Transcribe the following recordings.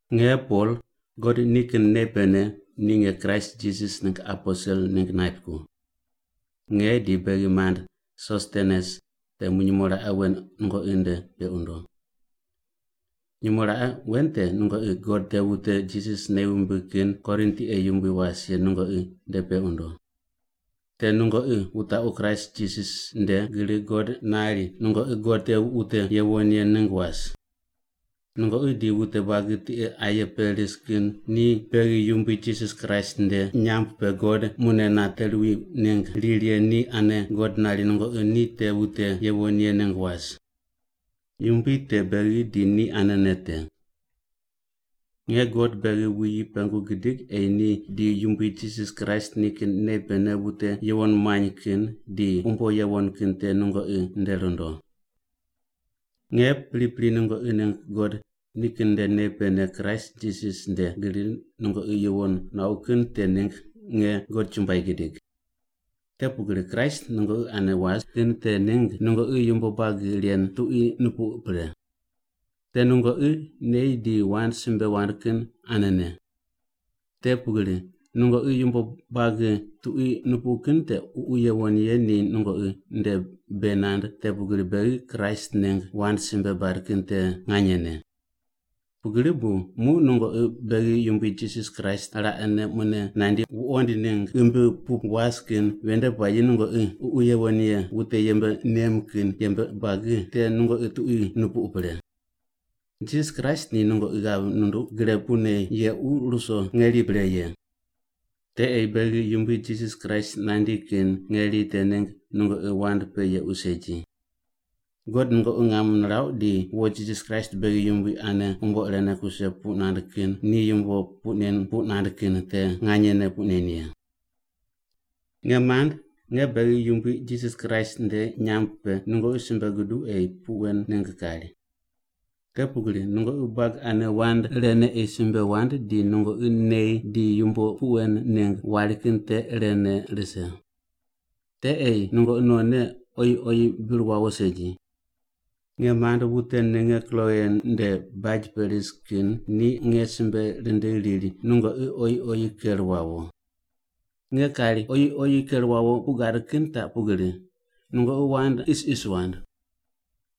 Nge Pol, God nikin nei pene ni nge Kraist Jisas ningg aposel ningg naip ko. Nge di beghi mand Sostenes temu nyumo raqe wen nungoqi nde peq wundo. Nyumo raqe wen te nungoqi God te wute Jisas nei wumbig kin Korin tiqe yumbui was ye nungoqi nde peq wundo. Te nungoqi wutaqu Kraist Jisas nde gri God nari nungoqi God te wute yuwon ye ningg was. Nungoqi di wute buagi tiqe aye pe ris kin ni beghi Yumbui Jisas Kraist nde nyamb pe God mune nate ruwi ningg riri ye ni anene God nari nungoqi ni te wute yuwon ye ningg was. Yumbui te beghi di ni anene te. Nge God beghi wuyi pengu gidig ei ni di Yumbui Jisas Kraist nikin nei pene wute yuwon muany kin di umbo yuwon kin te nungoqi nde rundo. Nge pripri nungoqi ningg God nikin nde nei pene Kraist Jisas nde gri nungoqi yuwon nuauq kin te ningg nge God chumbuai gidig. Te pugri Kraist nungoqi ane was kin te ningg nungoqi yumbo buagi ren tuqui nupuq pre. Te nungoqi nei di wand simbe wand kin anene. Te pugri nungoqi yumbo buagi tuqui nupuq kin te Ququ Yuwon Ye ni nungoqi nde bei nand te pugri beghi Kraist ningg wand simbe bad kin te nganyene. Pugri bu muq nungoqi beghi Yumbui Jisas Kraist raqene mune nandi wuqoind ningg ghimbi pu was kin ven nde puayi nungoqi Ququ Yuwon Ye wute yembe nem kin yembe buagi te nungoqi tuqui nupuq pre. Jisas Kraist ni nungoqi ghav nunduq gre pune yequ ruso ngeri pre ye. Te ei beghi Yumbui Jisas Kraist nandi kin ngeri te ningg nungoqi wand pe yequ segi. God nungoqi ngam nirauq ni wo Jisas Kraist beghi Yumbui ane umbo irene kuse puq nand kin ni yumbo puq nen puq nand kin te nganyene puq nen ye. Nge mand, nge beghi Yumbui Jisas Kraist nde nyamb pe nungoqi simbe guduq ei puq wen ningg kari. Te pugri nungoqi buagi ane wand irene ei simbe wand di nungoqi nei di yumbo puq wen ningg wari kin te irene rise. Te ei nungoqi nonne oyi oyi bir wawo segi. Nge mand, wute ninge Kloe nde baj pe ris kin ni nge simbe rindigh riri nungoqi oyi oyi ker wawo. Nge kari oyi oyi ker wawo puq gad kin taq pugri: Nungoqi wand isis wand.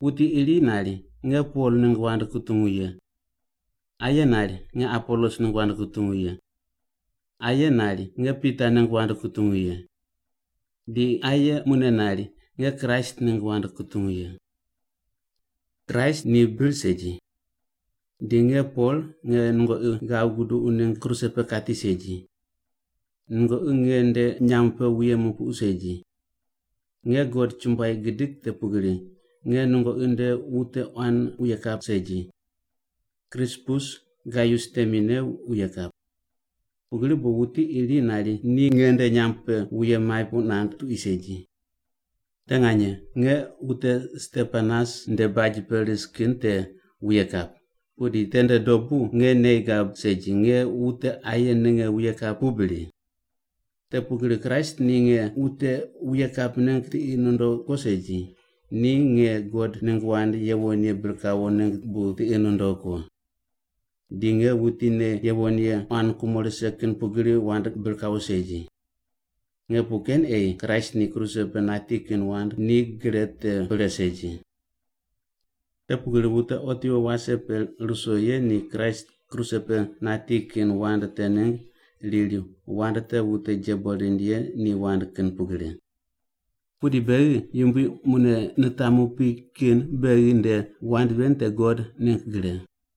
Wuti iri nari, “Nge Pol ningg wand kutungu ye.” Aye nari, “Nge Apolos ningg wand kutungu ye.” Aye nari, “Nge Pita ningg wand kutungu ye.” Di aye mune nari, “Nge Kraist ningg wand kutungu ye.” Kraist ni bir segi. Di nge Pol nge nungoqi ghav guduq ningg kruse pe kati segi. Nungoqi nge nde nyamb pe wuye mupuqu segi. Nge God chumbuai gidig te pugri nge nungoqi nde wute quan wuye kap segi, Krispus Gaius temine wuye kap. Pugri bu wuti iri nari ni nge nde nyamb pe wuye maip puq nand tuqui segi. (Te nganye nge wute Stepanas nde baj pe ris kin te wuye kap, pudi tende dobu nge nei gab segi nge wute aye ninge wuye kap pu bri?) Te pugri Kraist ni nge wute wuye kap ningg tiqi nundogh ko segi, ni nge God ningg wand yuwon ye bir kawo ningg bu tiqi nundogh ko. Di nge wuti nei yuwon ye quan kumo rise kin pugri wand bir kawo segi. Nge puq ken ei Kraist ni kruse pe nati kin wand ni gre te pre segi. Te pugri wute otiwo wase pe ruso ye ni Kraist kruse pe nati kin wand te ningg riri wand te wute jebo rind ye ni wand kin pugri. Pudi beghi Yumbui mune nitamu pi kin beghi nde wand ven te God ningg gre.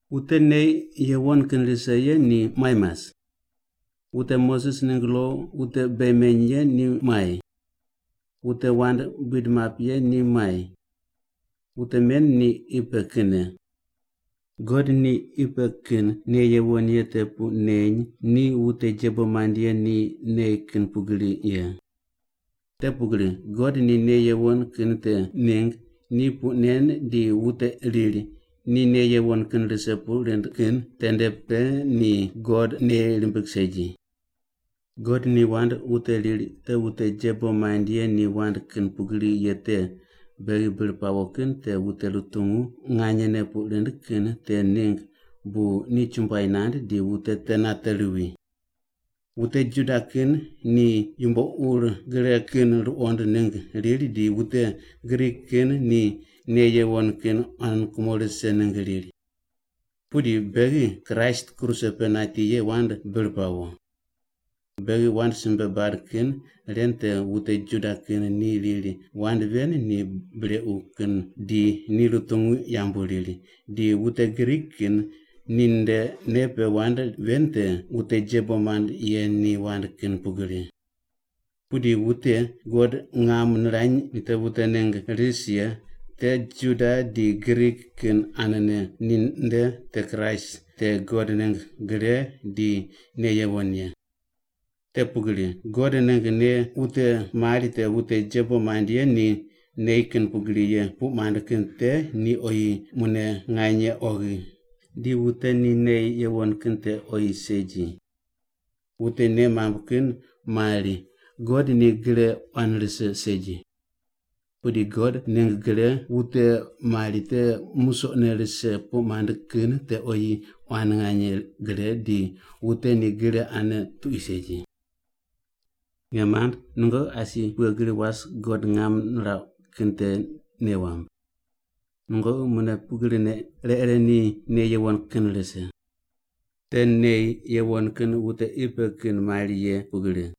Wute nei yuwon kin rise ye ni muai mas? Wute Moses ningg lo wute bei meny ye ni muai? Wute wand buid map ye ni muai? Wute men ni qi pe kinne. God ni qi pe kin nei yuwon ye te puq neny ni wute jebo mand ye ni nei kin pugri ye. Te pugri God ni nei yuwon kin te ningg ni puq nen di wute riri ni nei yuwon kin rise puq rind kin tende pe ni God nei rimbig segi. God ni wand wute riri te wute jebo mand ye ni wand kin pugri ye te beghi bir pawo kin te wute rutungu nganyene puq rind kin te ningg bu ni chumbuai nand di wute te nate ruwi. Wute Juda kin ni yumbo ur gre kin ruqond ningg riri di wute Grik kin ni nei yuwon kin quan kumo rise ningg riri. Pudi beghi Kraist kruse pe nati ye wand bir pawo. Beghi wand simbe bad kin ren te wute Juda kin ni riri wand ven ni brequ kin di ni rutungu yambu riri, di wute Grik kin ninde nei pe wand ven te wute jebo mand ye ni wand kin pugri. Pudi wute God ngam nirany ni te wute ningg ris ye, te Juda di Grik kin anene, ninde te Kraist te God ningg gre di nei yuwon ye. Te pugri God ningg nei wute mari te wute jebo mand ye ni nei kin pugri ye puq mand kin te ni oyi mune nganye oghi, di wute ni nei yuwon kin te oyi segi. Wute nei mamb kin mari God ni gre quan rise segi. Pudi God ningg gre wute mari te musoqne rise puq mand kin te oyi quan nganye gre, di wute ni gre ane tuqui segi. Nge mand, nungoqi asi pughe gri was God ngam nirauq kin te nei wamb. Nungoqi mune pugrine, ire ire ni nei yuwon kin rise. Te nei yuwon kin wute qi pe kin mari ye pugri.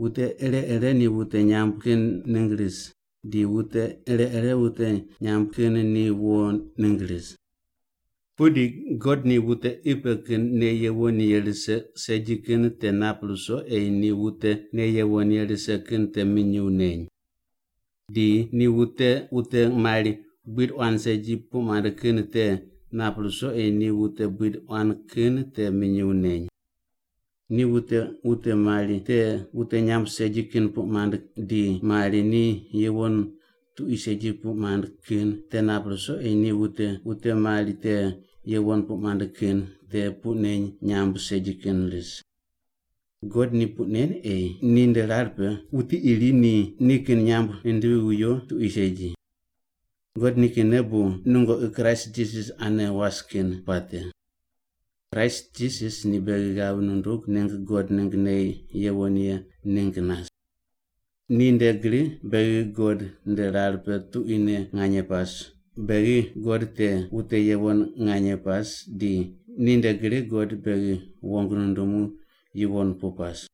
Wute ire ire ni wute nyamb kin ningg ris, di wute ire ire wute nyamb kin ni wo ningg ris. Pudi God ni wute qi pe kin nei yuwon ye rise segi kin te nap ruso ei ni wute nei yuwon ye rise kin te minyuw neny. Di ni wute wute mari buid quan segi puq mand kin te nap ruso ei ni wute buid quan kin te minyuw neny. Ni wute wute mari te wute nyamb segi kin puq mand di mari ni yuwon tuqui segi puq mand kin te nap ruso ei ni wute wute mari te yuwon puq mand kin te puq neny nyamb segi kin ris. God ni puq nen ei ninde rar pe wuti iri ni nikin nyamb nindivi viwo tuqui segi. God nikinne bu nungoqi Kraist Jisas ane was kin puate. Kraist Jisas ni beghi ghav nundug ningg God ningg nei yuwon ye ningg nas. Ninde gri beghi God nde rar pe tuquine nganye pas, beghi God te wute yuwon nganye pas, di ninde gri God beghi wong nundumu yuwon pu pas.